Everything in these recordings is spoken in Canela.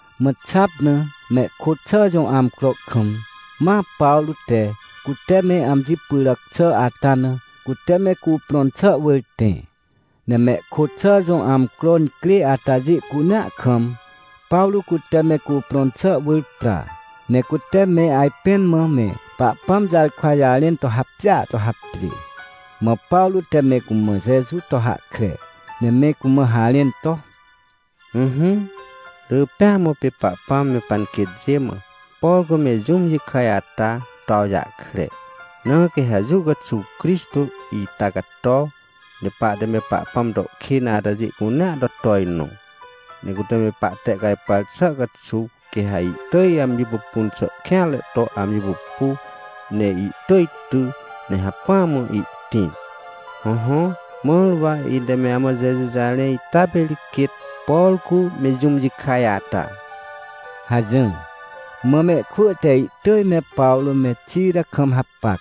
Mã xap na, mehkôt xà jõ amcro kam, ma Pawrô te, cute me amji pyràc xà ata na, cute me cuprõn xà wỳr tẽ. Ne mehkôt xà jõ amcro incrê atajê cunea kam, Pawrô cute me cuprõn xà wỳr pra. Ne cute me ajpẽn mã me Pahpãm jarkwa jarẽn to hapjêa to hapjê. Mã Pawrô te me cumã Jeju to hahkre, ne me cumã harẽn to: — Ỹhỹ, rỳ pêa mã pê Pahpãm me panquêtjê mã, por cu me jũm jikaj ata, to awjahkre. Na quê ha jũ caxuw Crixtô ita cato, ne pahte me Pahpãm to kên atajê cunea to tojnõ. Ne cute me pahtehcajpar xà caxuw quê ha ihtỳj amji pupun xà kêanre to amji pupu, ne ihtỳj ty, ne hacpỹa mã ihtĩr. Hõhõ, mãr wa ite me amã Jeju jarẽ ita pê ri quêt, por cu me jũm jikaj ata — hajỹr. Mã mehkwỳ te ihtỳj me Pawrô me Xira kam hapac,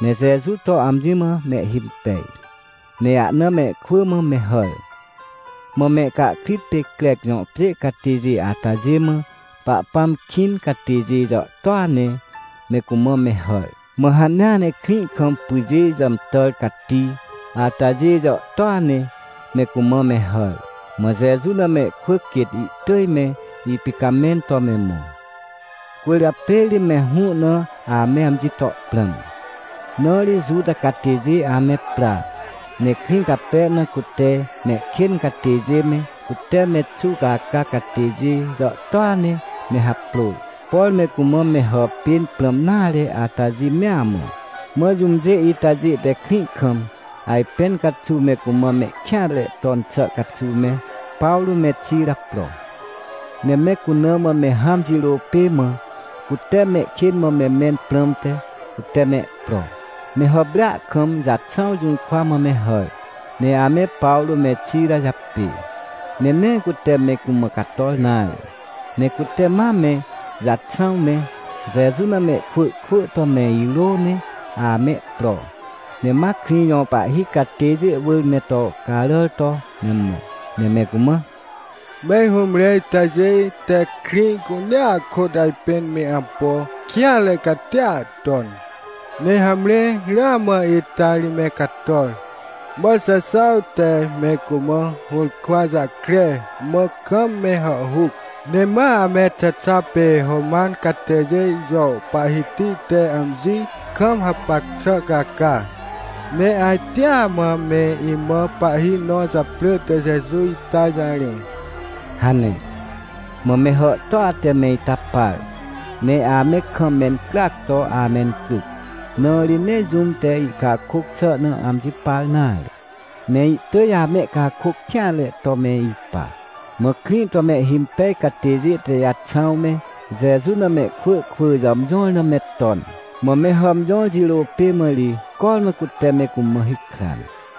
ne Jeju to amji mã mehhimpej, ne ahna mehkwỳ mã me hàr. Mã mehcahkrit pê Crec jõ pjê catêjê atajê mã Pahpãm kĩn catêjê jàhtôa ne me cumã me hàr. Mã hanea ne krĩ kam pyjê jàmtàr cati atajê jàhtôa ne me cumã me hàr. Mã Jeju na mehkwỳ quêt ihtỳj me ipicamẽn to me mõ. Cwỳrjapê ri me hũ na ame amji to prãm, na ri Juta catêjê ame pra, ne krĩ cape na cute mehkên catêjê me, cute me xuwcaca catêjê jàhtôa ne me haprôr, por me cumã me hàpên prãm nare atajê mea mã. Mã jũmjê itajê te krĩ kam ajpẽn caxuw me cumã mehkêanre ton xà caxuw me Pawrô me Xira pro. Ne me cuna mã me hãm jirô pê mã cute mehkên mã me mẽn prãmte cute mehpro. Me hàprêa kam Jaxãw jũrkwa mã me hàr, ne ame Pawrô me Xira japê. Ne nee cute me cumã cator nare, ne cute ma me Jaxãw me, Jeju na mehkwỳ kwỳ to me irô ne amehpro, ne ma krĩ jõ pahhi catêjê wỳr me to caràr to me mõ, ne me cumã: — Me hũmre itajê te krĩ cunea kôt ajpên me ampo kêanre catia ton. Ne hamre, ramã ita ri me cator! Mã Jaxãw te me cumã hũrkwa jahkre, mã kam me hàhhuc. Ne ma ame Xexa pê Roman catêjê jõ pahhiti te amji kam hapac xà caca, ne ajtea mã me imã pahhi nõ japrỳ te Jeju ita jarẽ — hane. Mã me hàhtôa te me ita par, ne ame kam mencryac to amencryc, na ri nee jũm te ihcakôc xà na amji par nare, ne ihtỳj amehcakôc kêanre to me ipa. Mã krĩ to mehhimpej catêjê te Jaxãw me, Jeju na mehkwỳ kwỳ jàmjõr na me ton, mã me hàmjõr jirô pê mã ri cormã cute me cumã hikran.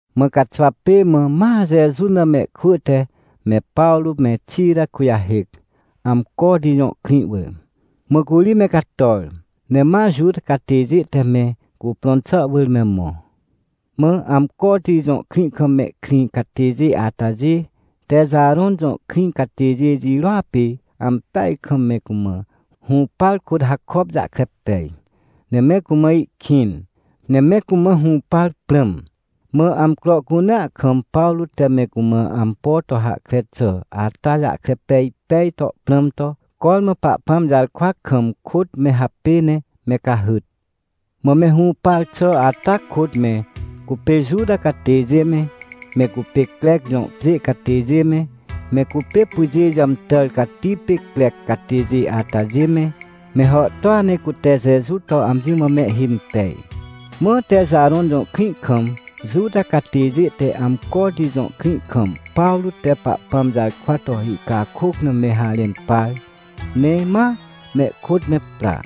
Mã caxwa pê mã, ma Jeju na mehkwỳ te me Pawrô me Xira kujahêc, Amcoti jõ krĩ wỳr. Mã curi me cator, ne ma Juta catêjê te me cuprõn xà wỳr me mõ. Mã Amcoti jõ krĩ kam mehkrĩ catêjê atajê Texarõn jõ krĩ catêjê jirôa pê ampeaj kam me cumã hũpar kôt hakop jahkre pej, ne me cumã ihkĩn, ne me cumã hũpar prãm. Mã amcro cunea kam Pawrô te me cumã ampo to hahkre xà ata jahkre pej pej to prãm to, cormã Pahpãm jarkwa kam kôt me hapê ne me cahyt. Mã me hũpar xà ata kôt me cupê Juta catêjê me, me cupê Crec jõ pjê catêjê me, me cupê pyjê jàmtàr cati pê Crec catêjê atajê me, me hàhtôa ne cute Jeju to amji mã mehhimpej. Mã Texarõn jõ krĩ kam, Juta catêjê te Amcoti jõ krĩ kam Pawrô te Pahpãm jarkwa to ihcakôc na me harẽn par, ne ma mehkôt me pra,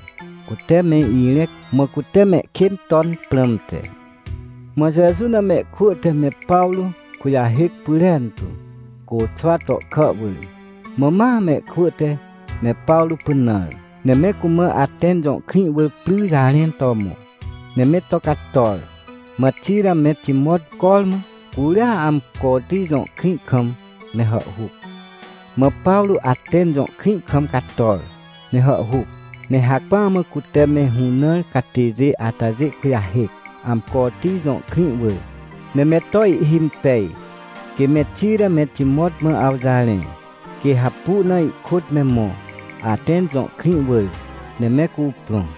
cute me irẽc, mã cute mehkên ton prãmte. Mã Jeju na mehkwỳ te me Pawrô kujahêc pyrentu, côxwa tohkà wỳr. Mã ma mehkwỳ te me Pawrô pynãr, ne me cumã Atẽn jõ krĩ wỳr pry jarẽn to mõ, ne me to cator. Mã Xira me Timot cormã curia Amcoti jõ krĩ kam me hàhhuc. Mã Pawrô Atẽn jõ krĩ kam cator, ne hàhhuc. Ne hacpỹa mã cute me hũnãr catêjê atajê kujahêc, Amcoti jõ krĩ wỳr, ne me to ihhimpej, quê me Xira me Timot mã awjarẽ, quê hapu na ihkôt me mõ, Atẽn jõ krĩ wỳr, ne me cuprõ.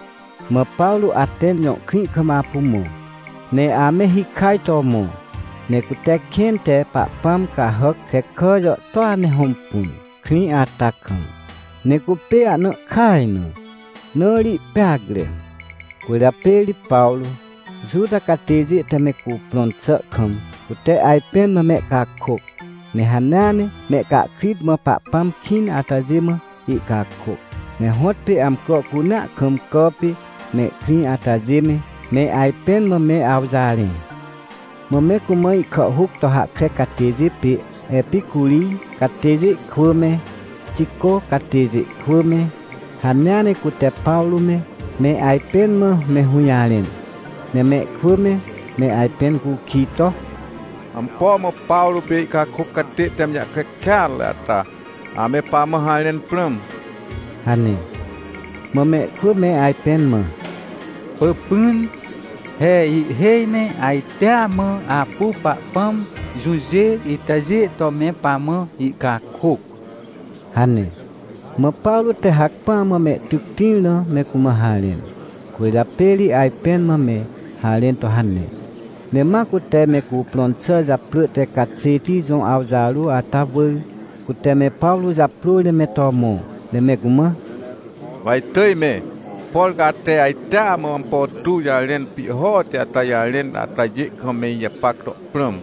Mã Pawrô Atẽn jõ krĩ kam apu mõ, ne ame hikaj to mõ. Ne cute kẽn te pahpãm cahàc krekà jàhtôa ne hõmpun, krĩ ata kam. Ne cupê ahna ihkaj na, na ri ihpeacre. Cwỳrjapê ri Pawrô, Juta catêjê te me cuprõn xà kam, cute ajpẽn mã mehcakôc, ne hanea ne mehcahkrit mã Pahpãm kĩn atajê mã ihcakôc. Ne hõtpê amcro cunea kam cà pê mehkrĩ atajê me, me ajpẽn mã me awjarẽ. Mã me cumã ihkàhhôc to hahkre catêjê pê Epicurij catêjê kwỳ me, Xicô catêjê kwỳ me, hanea ne cute Pawrô me, me ajpẽn mã me hũjarẽn. Ne mehkwỳ me, me ajpẽn cukij to: — Ampo mã Pawrô pê ihcakôc catê te amji jahkre kêatre ata ame pamã harẽn prãm? — hane. Mã mehkwỳ me ajpẽn mã: — Pỳpỹn, he ihhêj ne ajtea mã apu pahpãm jũjê itajê to me pamã ihcakôc — hane. Mã Pawrô te hacpỹa mã mehtyc tĩr na me cumã harẽn, cwỳrjapê ri ajpẽn mã me harẽn to hane. Ne ma cute me cuprõn xà japrỳ te Caxêti jõ awjarô ata wỳr, cute me Pawrô japrôr ne me to mõ, ne me cumã: — Wa itỳj me, por ca ate ajtea mã ampo tuw jarẽn pihhoti ata jarẽn atajê kam me ijapac to prãm,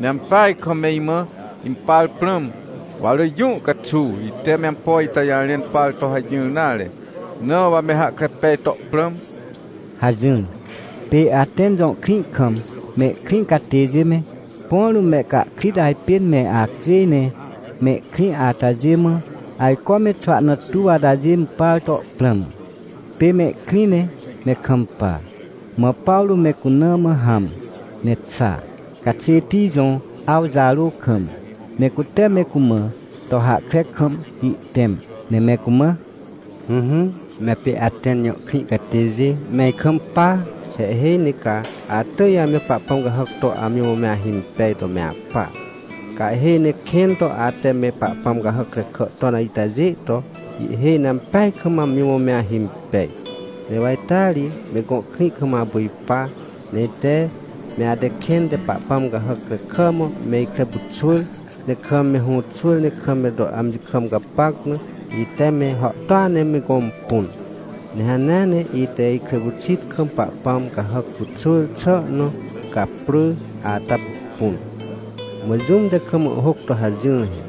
ne ampeaj kam me imã impar prãm. Wa rỳ jũ caxuw ite me ampo ita jarẽn par to hajỹr nare, na wa me hahkre pej to prãm — hajỹr. Pê Atẽn jõ krĩ kam mehkrĩ catêjê me, põ rũm mehcahkrit ajpên me acjêj ne mehkrĩ atajê mã, ajco me xwahna tuw atajê impar to prãm, pê mehkrĩ ne me kampa. Mã Pawrô me cuna mã hãm, ne xa, Caxêti jõ awjarô kam, ne cute me cumã to hahkre kam ihtẽm, ne me cumã: — Ỹhỹ, me apê Atẽn jõ krĩ catêjê, me ikampa! He ihhêj ne ca atỳj ame pahpãm cahàc to amji mã me ahimpej to me apa. Ca ihhêj ne kẽn to ate me pahpãm cahàc krekà ton itajê to, ihhêj ne ampeaj kam amji mã me ahimpej. Ne wa ita ri me gõ krĩ kam apu ipa, ne ite, me ate kẽn te pahpãm cahàc krekà mã me ikre pyxwỳr, ne kam me hũxwỳr, ne kam me to amji kam gapac na, ite me hàhtôa ne me gõmpun. Ne hanea ne ite ikre pyxit kam pahpãm cahàc pyxwỳr xà nõ caprỳ ata pupun. Mã jũm te kam ihhôc to hajỹr he: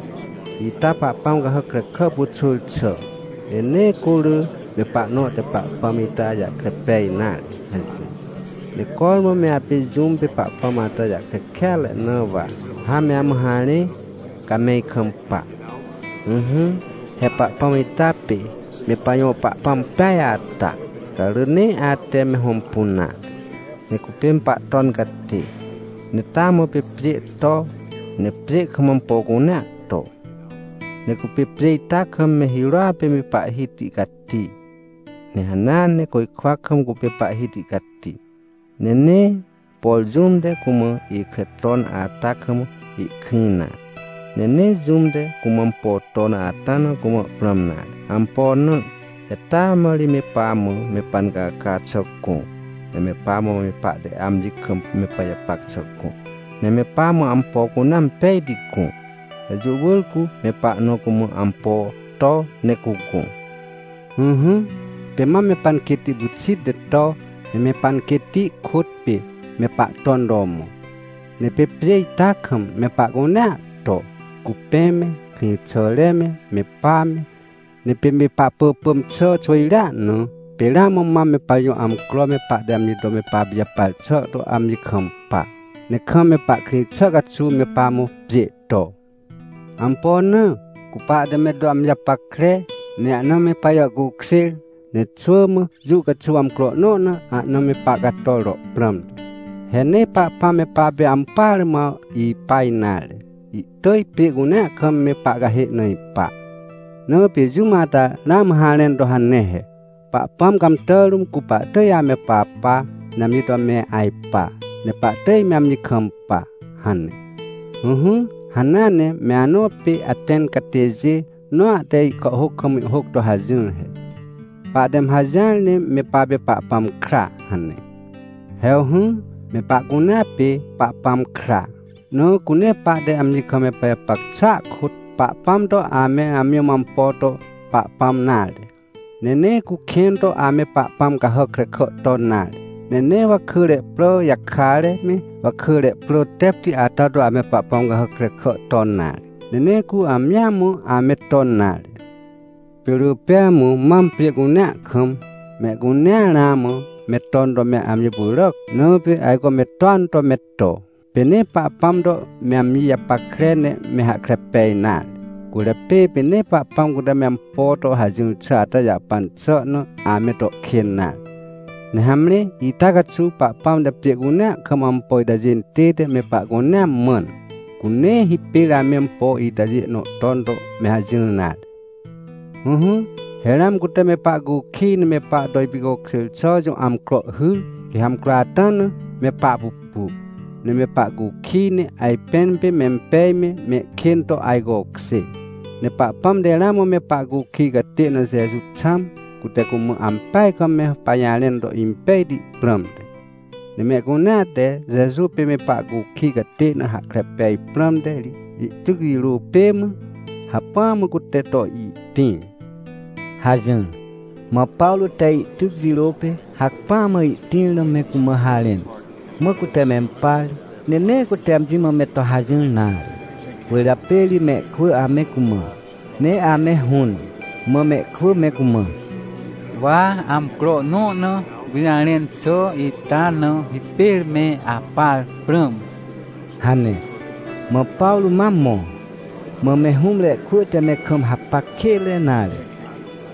“Ita pahpãm cahàc krekà pyxwỳr xà, ne nee cu rỳ me pahnõ te Pahpãm ita jahkre pej nare” hajỹr. Ne cormã me apê jũm pê Pahpãm ata jahkre kêatre na wa ha me amã harẽ, ca me ikampa. — Ỹhỹ, he Pahpãm ita pê me pajõ Pahpãm peaj ata, ca rỳ nee ate me hõmpun nare. Ne cupê me Pahton catê. Ne taa mã pê pjê to, ne pjê kam ampo cunea to. Ne cupê pjê ita kam me hirôa pê Pahhiti cati, ne hanea ne côjkwa kam cupê Pahhiti cati. Ne nee, por jũm te cumã ikre ton ata kam ihkrĩ nare. Ne nee jũm te cumã ampo ton ata na cumã prãm nare. Ampo na? He taa mã ri me pamã me pancaca xà gõ, ne me pamã me pahte amji kam me pajapac xà gõ, ne me pamã ampo cunea impejti gõ. Ne jũ wỳr cu me pahnõ cumã ampo to ne cugõ. — Ỹhỹ, pê mam me panquêtti pyxit ne to, ne me panquêtti kôt pê me pahton to mõ. Ne pê pjê ita kam me pahcunea to, cupẽ me, krĩxàre me, me pa me. Ne pê me pahpỳpỳm xà xwỳjrea na, pê ramã mam me pajõ amcro me pahte amji to me papijapar xà to amji kampa, ne kam me pahkrĩ xà caxuw me pamã pjê to. Ampo na? Cu pahte me to amji japackre, ne ahna me pajàhcukjêr, ne xwỳ mã jũ caxuw amcro nõ na ahna me pahcator to prãmte. He nee Pahpãm me papê ampỳare mã ipa nare, ihtỳj pjê cunea kam me pahcahê na ipa. Na pê jũm ata ramã harẽn to hane he: “Pahpãm cãmtà rũm cu pahtỳj ame papa, ne amji to me ajpa, ne pahtỳj me amji kampa” hane. Ỹhỹ, hanea ne me anõ pê Atẽn catêjê nõa te ihkàhhôc kam ihhôc to hajỹr he: “Pahte me hajỹar ne me papê Pahpãm kra” hane. — Hewhỹ, me pahcunea pê Pahpãm kra. Na cu nee pahte amji kam me pajapac xàa kôt, Pahpãm to ame amji mã ampo to pahpãm nare. Ne nee cu kẽn to ame pahpãm cahàc krekà ton nare. Ne nee wakỳre prà jakare me, wakỳre prà tepti ata to ame pahpãm cahàc krekà ton nare. Ne nee cu amjia mã ame ton nare. Pê rỳ pêa mã mam pjê cunea kam, mehcunea ramã me ton to me amji pyràc tu, na pê ajco me toan to me to. Pê nee Pahpãm to me amji japackre, ne me hahkre pej nare, cwỳrjapê pê nee Pahpãm cute me ampo to hajỹr xà ata jahpan xà na ame to kên nare. Ne hamre, ita caxuw Pahpãm te pjê cunea kam ampo itajê intête me pahcunea mãn, cu nee hipêr ame ampo itajê nõ ton to me hajỹr nare. Ỹhỹ, he ramã cute me pahcukij ne me pahto ipicokjêr xà jõ amcro hyr, quê ha amcro ata na me pahpupu, ne me pahcukij, ne ajpẽn pê mempej me, mehkên to ajcokjê. Ne Pahpãm te ramã me pahcukij catê na Jeju xãm, cute cumã ampeaj kam me pajarẽn to impejti prãmte. Ne mehcunea te Jeju pê me pahcukij catê na hahkre pej prãmte ri ihtyc jirô pê mã, hacpỹa mã cute to ihtĩr — hajỹr. Mã Pawrô te ihtyc jirô pê hacpỹa mã ihtĩr na me cumã harẽn, mã cute mempar, ne nee cute amji mã me to hajỹr nare. Cwỳrjapê ri mehkwỳ ame cumã, ne ame hũn, mã mehkwỳ me cumã: — Wa amcro nõ na gũjarẽn xà ita na hipêr me apar prãm — hane. Mã Pawrô ma mõ. Mã me hũmre kwỳ te me kam hapac kênre nare,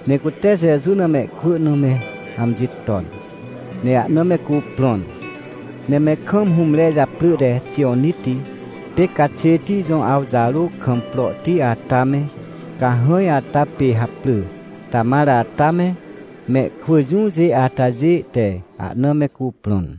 ne cute Jeju na mehkwỳ na me amji ton, ne ahna me cuprõn. Ne me kam hũmre japrỳ te Tijoniti pê Caxêti jõ awjarô kam prohti ata me, cahãj ata pê haprỳ Tamar ata me, mehkwỳ jũjê atajê te ahna me cuprõn.